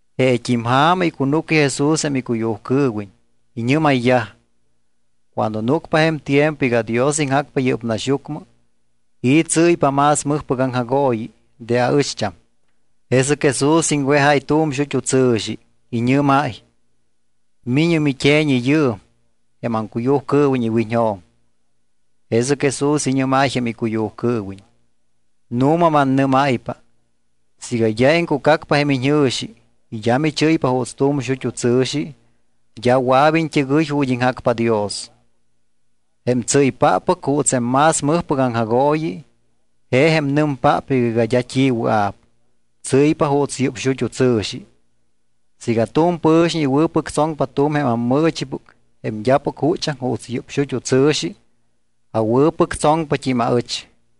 Jeet́im ja̱ma icunúcyaj Jesús jém icuyujcɨɨwiñ. Iñɨ́mayyaj: —Cuando núcpa jém tiempo iga Dios iŋjacpa yɨ́p naxyucmɨ, ¿i̱ tsɨ́ypa más mɨjpɨc aŋjagooyi de aɨcht́am? Jesɨc Jesús iŋwejáy tu̱m xut́u tsɨ̱xi. Iñɨ́máy: —Mi̱ñɨ mit́e̱ñi yɨɨm jém aŋcuyujcɨɨwiñ iwiñjo̱m. Jesɨc Jesús iñɨ́máy jém icuyujcɨɨwiñ: —Nu̱ma mannɨ́máypa, siiga d́a iŋcucacpa jém iñjɨ̱xi y d́a michɨ́ypa juuts tu̱m xut́u tsɨ̱xi, d́a wɨa̱p iñt́ɨgɨy ju̱t́ iŋjacpa Dios. Jém tsɨ́ypáppɨc juuts jém más mɨjpɨc aŋjagooyi, je jém nɨmpáppɨc iga d́a t́i wɨa̱p, tsɨ́ypa juuts yɨ́p xut́u tsɨ̱xi. Siiga tu̱m pɨ̱xiñ iwɨ̱pɨctsoŋpa tu̱m jém ammɨɨchipɨc jém d́apɨc juchaŋ juuts yɨ́p xut́u tsɨ̱xi, awɨ̱pɨctsoŋpat́im aɨch.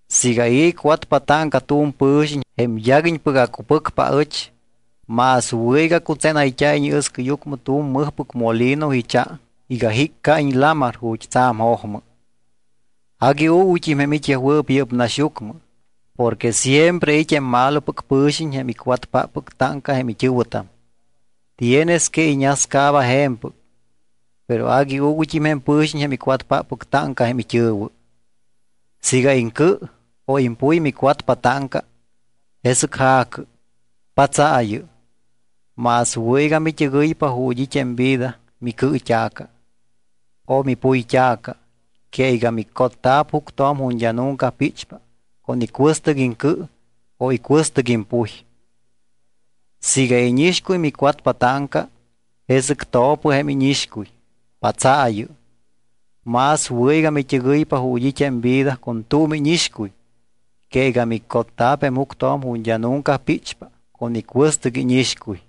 ’Siiga i̱ icwatpa táŋca tu̱m pɨ̱xiñ, jém yaguiñpɨc acupɨcpa aɨch, más wɨ̱ iga cutsénayt́a̱iñ iɨscɨyucmɨ tu̱m mɨjpɨc molino icha iga jiccaiñ lamar ju̱t́ tsa̱m jojmɨ. Agui uuguyt́im jém it́yajwɨɨp yɨ́p naxyucmɨ porque siempre it́ jém malopɨc pɨ̱xiñ jém icwatpáppɨc táŋca jém it́ɨ̱wɨtam. Tienes que iñascaaba je̱mpɨc, pero agui uuguyt́im jém pɨ̱xiñ jém icwatpáppɨc táŋca jém it́ɨ̱wɨ. ’Siiga iŋcɨ o impuy micwatpa táŋca, jesɨc ja̱cɨ, patsaayɨ. Más wɨ̱ iga mit́ɨgɨypa ju̱t́ it́ jém vida micɨɨt́a̱ca o mipuyt́a̱ca que iga micotta̱p juctjo̱m ju̱t́ d́a nunca píchpa con icuɨstɨc iŋcɨ o icuɨstɨc impuy. Siiga íñixcuy micwatpa táŋca, jesɨc to̱pɨ jém íñixcuy, patsaayɨ. Más wɨ̱ iga mit́ɨgɨypa ju̱t́ it́ jém vida con tu̱m íñixcuy que iga micotta̱p jém juctjo̱m ju̱t́ d́a nunca píchpa con icuɨstɨc íñixcuy.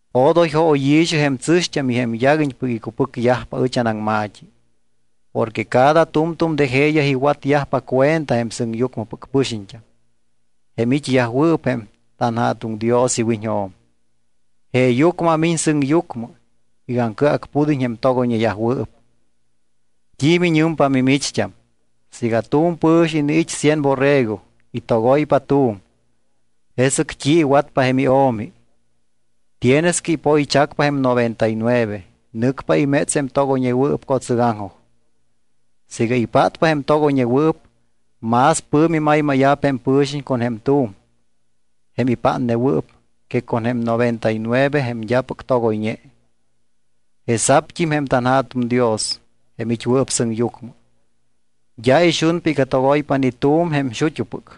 ’Odoy jóyi̱xɨ jém tsɨ̱xt́am y jém yaguiñpɨc icupɨcyajpa ɨch anaŋma̱t́i. Porque cada tu̱mtu̱m de jeeyaj iwatyajpa cuenta jém sɨŋyucmɨpɨc pɨxiñt́am, jém it́yajwɨɨp jém tanJa̱tuŋ Dios iwiñjo̱m. Jeeyucmɨ amiñ sɨŋyucmɨ iga aŋcɨacpud́iñ jém togoyñeyajwɨɨp. ’¿T́i miñɨmpa mimicht́am? Siiga tu̱m pɨ̱xiñ iniit́ cien borrego y togoypa tu̱m, ¿jesɨc t́i iwatpa jém io̱mi? Tienes que ipoychacpa jém noventa y nueve. Nɨcpa iméts jém togoyñewɨɨp co̱tsɨgaŋjoj. Siiga ipátpa jém togoyñewɨɨp, más pɨ̱mi maymáya̱p jém pɨ̱xiñ con jém tu̱m jém ipátnewɨɨp que con jém noventa y nueve jém d́apɨc togoyñe. Jesa̱pt́im jém tanJa̱tuŋ Dios, jém it́wɨɨp sɨŋyucmɨ, d́a ixunpa iga togoypa ni tu̱m jém xut́upɨc.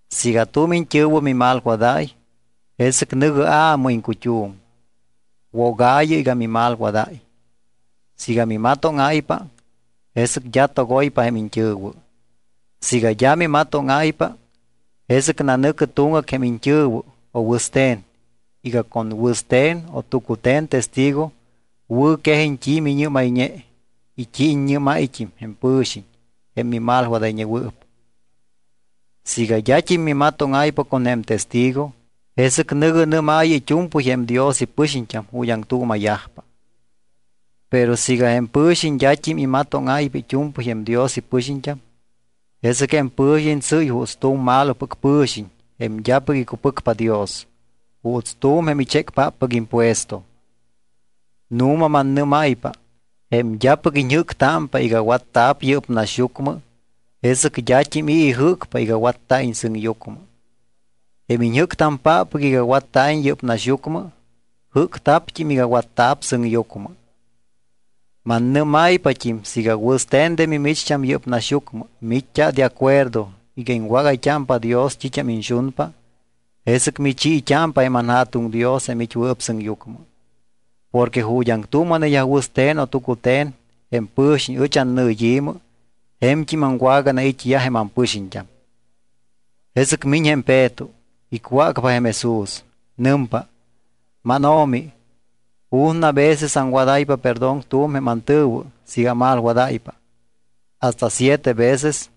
’Siiga tu̱m iñt́ɨ̱wɨ mimalwadáy, jesɨc nɨ̱gɨ aamɨ iŋcut́um, wogaayɨ iga mimalwadáy. Siiga mimatóŋáypa, jesɨc d́a togoypa jém iñt́ɨ̱wɨ. Siiga d́a mimatóŋáypa, jesɨc nanɨ̱cɨ tuŋgac jém iñt́ɨ̱wɨ o wɨste̱n iga con wɨste̱n o tucute̱n testigo wɨ̱quejiñ t́i miñɨ́mayñe y t́i iññɨ́máyt́im jém pɨ̱xiñ jém mimalwadayñewɨɨp. Siiga d́at́im mimatóŋáypa con jém testigo, jesɨc nɨ̱gɨ nɨ́maayɨ it́u̱mpɨy jém Dios ipɨxiñt́am ju̱t́ aŋtuuma̱yajpa. Pero siiga jém pɨ̱xiñ d́at́im imatóŋáypa it́u̱mpɨy jém Dios ipɨxiñt́am, jesɨc jém pɨ̱xiñ tsɨ́y juuts tu̱m malopɨc pɨ̱xiñ jém d́apɨc icupɨcpa Dios, juuts tu̱m jém ichécpáppɨc impuesto. ’Nu̱ma mannɨ́máypa jém d́apɨc iñjɨ́ctámpa iga watta̱p yɨ́p naxyucmɨ, jesɨc d́at́im i̱ ijɨ́cpa iga watta̱iñ sɨŋyucmɨ. Jém iñjɨ́cpáppɨc iga watta̱iñ yɨ́p naxyucmɨ, jɨ́cta̱pt́im iga watta̱p sɨŋyucmɨ. ’Mannɨ́máypat́im siiga wɨste̱n de mimicht́am yɨ́p naxyucmɨ miit́t́a de acuerdo iga iŋwágayt́ámpa Dios t́it́am iñxunpa, jesɨc michiit́ámpa jém anJa̱tuŋ Dios jém it́wɨɨp sɨŋyucmɨ. Porque ju̱t́ aŋtuuma̱neyaj wɨste̱n o tucute̱n jém pɨ̱xiñ ɨch annɨyi̱mɨ je̱mt́im aŋwaganait́yaj jém ampɨxiñt́am. Jesɨc miñ jém Peto. Icwácpa jém Jesús. Nɨmpa: —MánO̱mi, ¿ju̱na veces aŋwadáypa perdón tu̱m jém antɨ̱wɨ siiga amalwadáypa? ¿Hasta siete veces?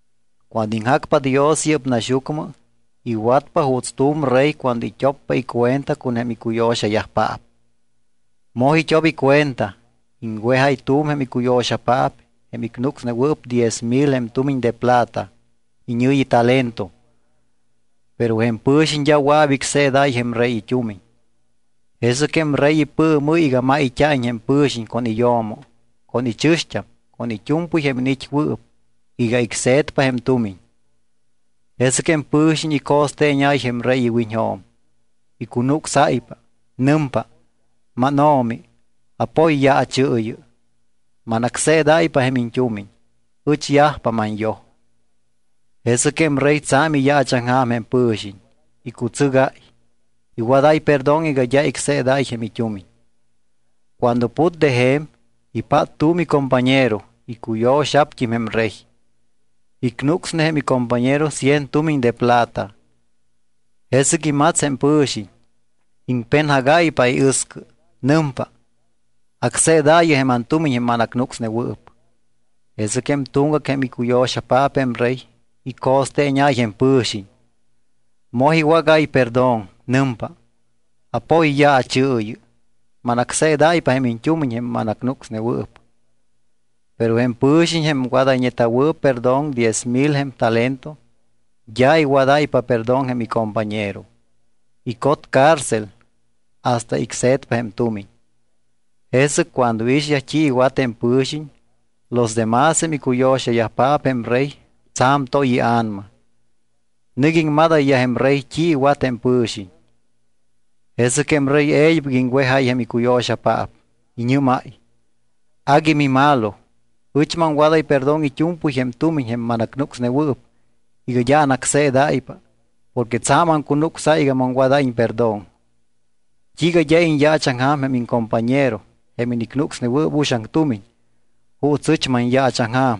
’Cuando iŋjacpa Dios yɨ́p naxyucmɨ, iwatpa juuts tu̱m rey cuando it́oppa icuenta con jém icuyo̱xayajpaap. Moj it́op icuenta, iŋwejáy tu̱m jém icuyo̱xapaap jém icnucsnewɨɨp diez mil jém tumiñ de plata iñɨ̱yi talento. Pero jém pɨ̱xiñ d́a wɨa̱p icseedáy jém rey it́umiñ. Jesɨc jém rey ipɨɨmɨ́y iga máyt́a̱iñ jém pɨ̱xiñ con iyo̱mo con ichɨ̱xt́am con it́u̱mpɨy jém iniit́wɨɨp iga icse̱tpa jém tumiñ. Jesɨc jém pɨ̱xiñ ico̱steeñáy jém rey iwiñjo̱m. Icunucsáypa. Nɨmpa: “Máno̱mi, apoyyaachɨɨyɨ. Manacseedáypa jém iñt́umiñ. Ɨch yajpa manyoj.” Jesɨc jém rey tsa̱m iyaachaŋja̱m jém pɨ̱xiñ. Icutsɨgáy, iwadáy perdón iga d́a icseedáy jém it́umiñ. Cuando put de je̱m, ipát tu̱m icompañero, icuyo̱xa̱pt́im jém rey. Icnucsne jém icompañero cien tumiñ de plata. Jesɨc imats jém pɨ̱xiñ, iŋpenjagáypa iɨscɨ. Nɨmpa: “Acseedaayɨ jém antumiñ jém manacnucsnewɨɨp.” Jesɨc jém tuŋgac jém icuyo̱xapaap jém rey, ico̱steeñáy jém pɨ̱xiñ. Moj iwágáy perdón. Nɨmpa: “Apoyyaachɨɨyɨ. Manacseedáypa jém iñt́umiñ jém mannucsayñewɨɨp.” Pero jém pɨ̱xiñ jém wadayñeta̱wɨɨp perdón diez mil jém talento, d́a iwadáypa perdón jém icompañero. Icot cárcel hasta icse̱tpa jém tumiñ. Jesɨc cuando iixyaj t́i iwat jém pɨ̱xiñ, los demás jém icuyo̱xayajpaap jém rey, tsa̱m toy ia̱nama, nɨc iŋmadayyaj jém rey t́i iwat jém pɨ̱xiñ. Jesɨc jém rey e̱ybɨc iŋwejáy jém icuyo̱xapaap. Iñɨ́máy: “Agui mimalo. Ɨch maŋwadáy perdón it́u̱mpɨy jém tumiñ jém manacnucsnewɨɨp iga d́a anácseedáypa porque tsa̱m aŋcunucsáy iga maŋwadáyiñ perdón. ¿T́iiga d́a iñyaachaŋja̱m jém iŋcompañero jém inicnucsnewɨɨp uxaŋ tumiñ juuts ɨch manyaachaŋja̱m?”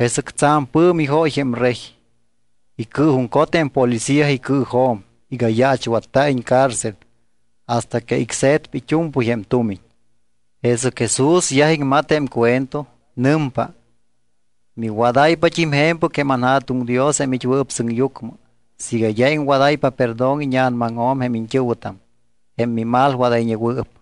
Jesɨc tsa̱m pɨ̱mi jóy jém rey. Icɨɨjuŋcot jém policía icɨɨjo̱m iga yaachwatta̱iñ cárcel hasta que icse̱tpa it́u̱mpɨy jém tumiñ. Jesɨc Jesús yaj iŋmat jém cuento. Nɨmpa: —Miwadáypat́im je̱mpɨc jém anJa̱tuŋ Dios jém it́wɨɨp sɨŋyucmɨ siiga d́a iŋwadáypa perdón íña̱namaŋjo̱m jém iñt́ɨ̱wɨtam, jém mimalwadayñewɨɨp.